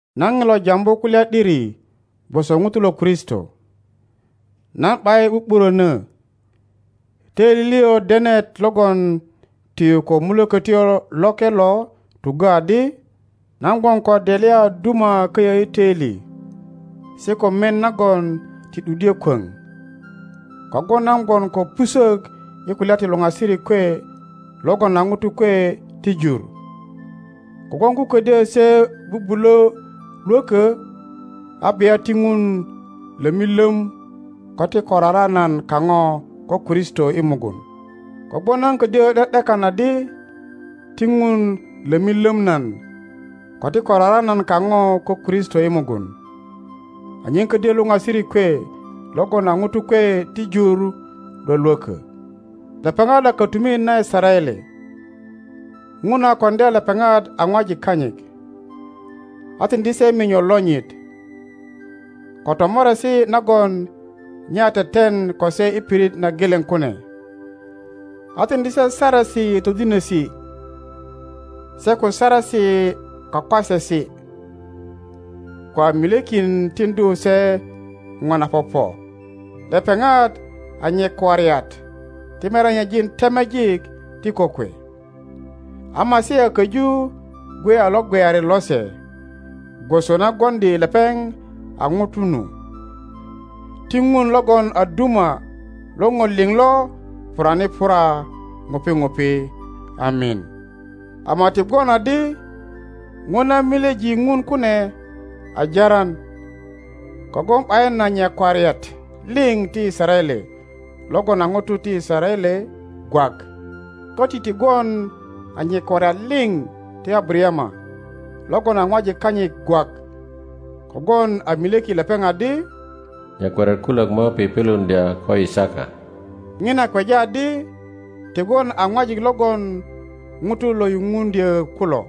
Nan ŋilo jambu kulya ’dirigwoso ŋuto lo Kristo, nan ’bayin ’bu ’burönö; töili liŋ denet logon tiyu ko Mukölötyo Loke lo tuggö adi nan gwon ko delya a duma köyö i töili se ko mien nagon ti ’duddyö kwöŋ. Kogwon nan gwon ko pusök i kulya ti luŋasirik kwe logon a ŋutu kwe ti jur. Kogwon ko ködyö se bubulö lwökö, a bia ti Ŋun lömi löm ko ti korara nan kaŋo ko Kristo i mugun. Kogwon nan ködyö ’de ’dekan adi ti Ŋun lömi löm nan ko ti korara nan kaŋo ko Kristo i mugun, anyen ködyö luŋasirik kwe logon a ŋutu kwe ti jur lwölwökö. Lepeŋat a kötumit na Yisaraele; Ŋun a koŋdya lepeŋat a ŋwajik kanyit, a tiŋdi se minyo lonyit, ko tomoresi nagon nye a teten ko se i pirit na geleŋ kune, a tiŋdi se Saresi todinesi, se ko saresi kwakwasesi, ko a milyekin tiŋdu se ŋo na popo. Lepeŋat a nyakwariat ti merenyejin temejik ti kokwe, a Masia köju gwe a lo gweyari lose, gwoso na gwoŋdi lepeŋ a ŋuto nu. Ti Ŋun logon a duma lo ŋo liŋ lo purani pura ŋupi ŋupi. Amin! Ama ti gwon adi ŋo na milyeji Ŋun kune a jaran; kogwon ’bayin a nyakwariat liŋ ti Yisaraele logon a ŋutu ti Yisaraele gwak. Köti ti gwon a nyakwariat liŋ ti Abarayama logon a ŋwajik kanyit gwak, kogwon a milyeki lepeŋ adi, Nyakwariat kulök mo pipiluŋdya ko Yisaka. Ŋina kweja adi ti gwon a ŋwajik logon ŋutu lo yuŋ undyö kulo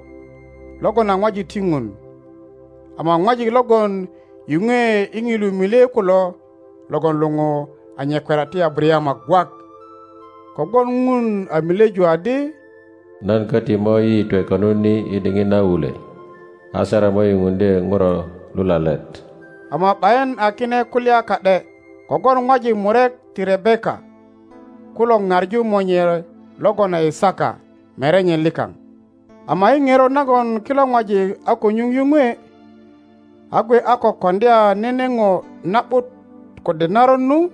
logon a ŋwajik ti Ŋun, ama ŋwajik logon yuŋwe i ŋilu milye kulo logon luŋu a nyakwariat ti Abarayama gwak. Kogwon Ŋun a milyeju adi, Nan köti mo yiyitwe konut ni i diŋit na wulwe, a Sara mo yuŋuŋdye ŋuro lulalet. Ama ’bayin a kine kulya ka ’de, kogwon ŋwajik murek ti Rebeka kulo ŋaŋu monye logon a Yisaka merenye likaŋ. Ama i ŋerot nagon kilo ŋwajik a ko nyuŋ yuŋwe, a gwe a ko koŋdya nene ŋo na ’but kode naron nu,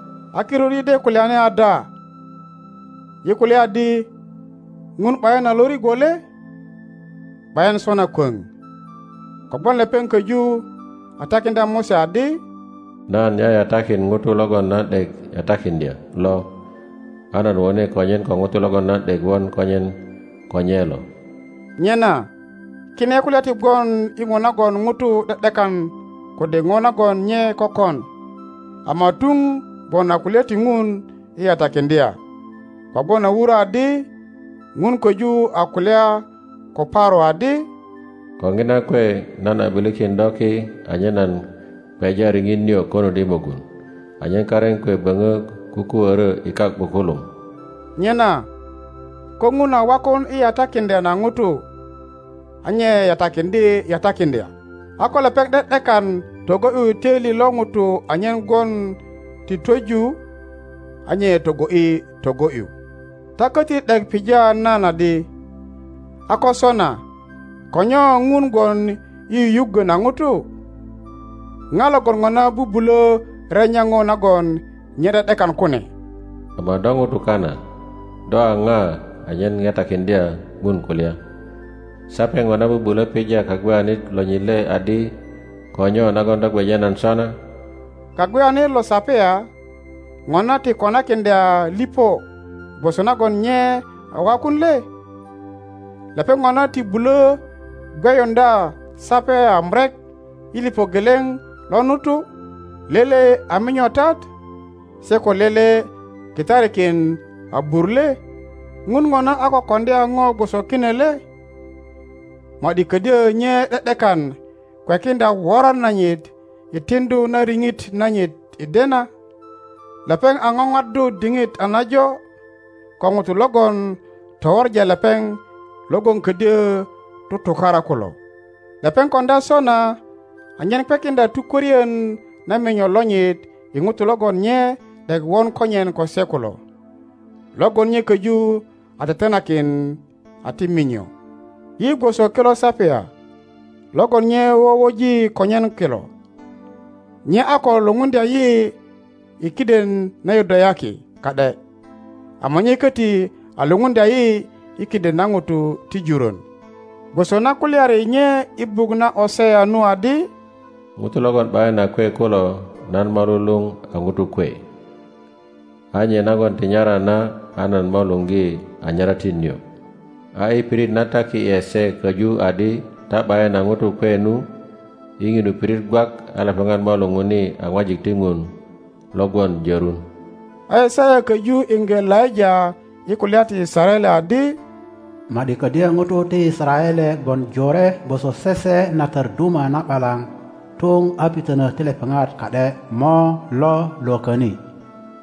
A kirut yi de kulyani ada? Yi kulya adi Ŋun ’bayin a lo rigwo le? ’Bayin sona kwöŋ. Kogwon lepeŋ köju a takiŋdya Mose adi, Nan yayatakin ŋuto logon nan ’dek yatakiŋdya lo, a nan wone konyen ko ŋuto logon nan ’dek won konyen ko nye lo. Nyena kine kulya ti gwon i ŋo nagon ŋuto ’de ’dekan kode ŋo nagon nye kökon, ama tuŋ gwon a kulya ti Ŋun i yatakiŋdya. Kogwon a wurö adi Ŋun köju a kulya ko Paro adi, Ko ŋina kwe nan a ’bilikin do ki anyen nan kweja riŋit nio konut i mugun, anyen karin kwe böŋö kukuörö i kak ’bukuluŋ. Nyena ko Ŋun a wakun i yatakiŋdya na ŋuto a nye yatakiŋdye yatakiŋdya, a ko lepeŋ ’de ’dekan togo ’yu töili lo ŋuto anyen gwon ti twöju a nye togo ’yi togo ’yu. Ta köti ’dek pija nan adi, A ko sona ko nyo Ŋun gwon i yuyuggö na ŋutu? Ŋa logon ŋona bubulö renya ŋo nagon nye ’de ’dekan kune? Ama do ŋuto kana, do a ŋa anyen ŋetakiŋdya Ŋun kulya? Sape ŋona bubulö pija kagweyanit lonyit le adi, Ko nyo nagon do gweja nan sona? Kagweyanit lo sapya ŋona ti konakiŋdya liŋo gwoso nagon nye a wakun le? Lepeŋ ŋona ti bulö gweyuŋdya sapya murek i liŋo geleŋ lo nutu, lele a minyotat se ko lele kitarikin abur le? Ŋun ŋona a ko koŋdya ŋo gwoso kine le? Ma ’di ködyö nye ’de ’dekan kwekiŋdya woran nanyit i tiŋdu na riŋit nanyit i dena, lepeŋ a ŋoŋaddu diŋit a najo ko ŋutu logon towoŋa lepeŋ logon ködyö tutukara kulo. Lepeŋ koŋdya sona anyen kwekiŋdya tukworien na minyo lonyit i ŋutu logon nye ’dek won konyen ko se kulo, logon nye köju a tetenakin a ti minyo. Yi gwoso kilo sapya logon nye wowoji konyen kilo. Nye a ko lupuŋdya yi i kiden na Yudayaki ka ’de, ama nye köti a lupuŋdya yi i kiden na ŋutu ti jurön; gwoso na kulyari nye i buk na Osea nu adi, Ŋutu logon ’bayin a kwe kulo, nan mo luluŋ a ŋutu kwe, a nye nagon ti nyara na, a nan mo luŋgi a nyaratti nio. A i pirit na taki ’e se köju adi, Ta ’bayin a ŋutu kwe nu, i ŋinu pirit gwak a lepeŋat mo luŋuni a ŋwajik ti Ŋun lo gwon jörun. A Yisaya köju iŋge laŋa i kulya ti Yisaraele adi, Ma ’di ködyö ŋutu ti Yisaraele gwon jore gwoso sese na tör duma na ’balaŋ, tuŋ a pitönö ti lepeŋat ka ’de mo lo lwököni;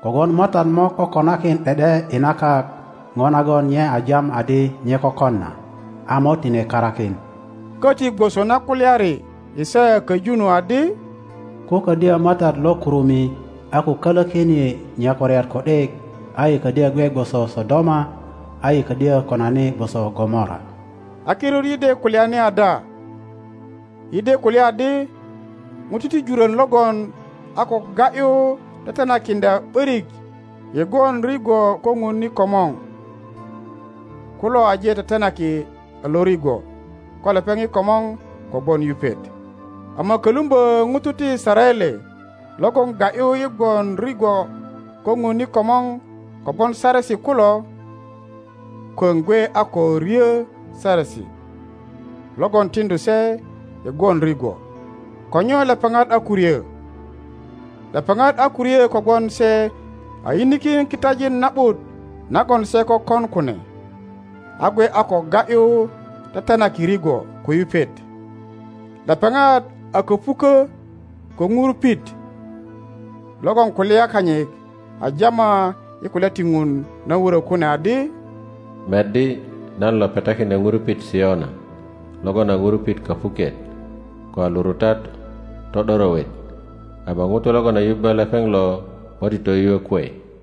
kogwon Matat mo kokonakin ’de ’de i na kak ŋo nagon nye a jam adi nye kökon na, a mo tine karakin. Koti gwoso na kulyari Yisaya köju nu adi, Ko ködyö Matat lo kurumi a ko kölökin yi nyakwariat ku ’dik, a yi kodyö gwe gwoso Sodoma, a yi ködyo konani gwoso Gomora. A kirut yi de kulyani ada? Yi de kulya adi ŋutu ti jurön logon a ko ga ’yu tetenakiŋdya ’börik i gwon rigwo ko ŋun i komor kulo aje tetenaki a lo rigwo ko lepeŋ i komor kogwon yupet. Ama kölumbö ŋutu ti Yisaraele logon ga ’yu i gwon rilo ko Ŋun i komor kogwon saresi kulo, kwöŋ gwe a ko ryö saresi logon tiŋdu se i gwon rigwo. Ko nyo lepeŋat a ko ryö? Lepepat a ko ryö kogwon se a yinikin kitajin na ’but nagon se kökon kune, a gwe a ko ga ’yu tetenaki rigwo ko yupet. Lepeŋat a köpukö ko ŋurupit, logon kulya kanyit a jama i kulya ti Ŋun na wurö kune adi, Meddi, nan lo petakiŋdya ŋurupit Siona, logon a ŋurupit köpuket, ko a lurutat to ’dorowet; ama ŋuto logon a yubbö lepeŋ lo mo ti toyuö kwe.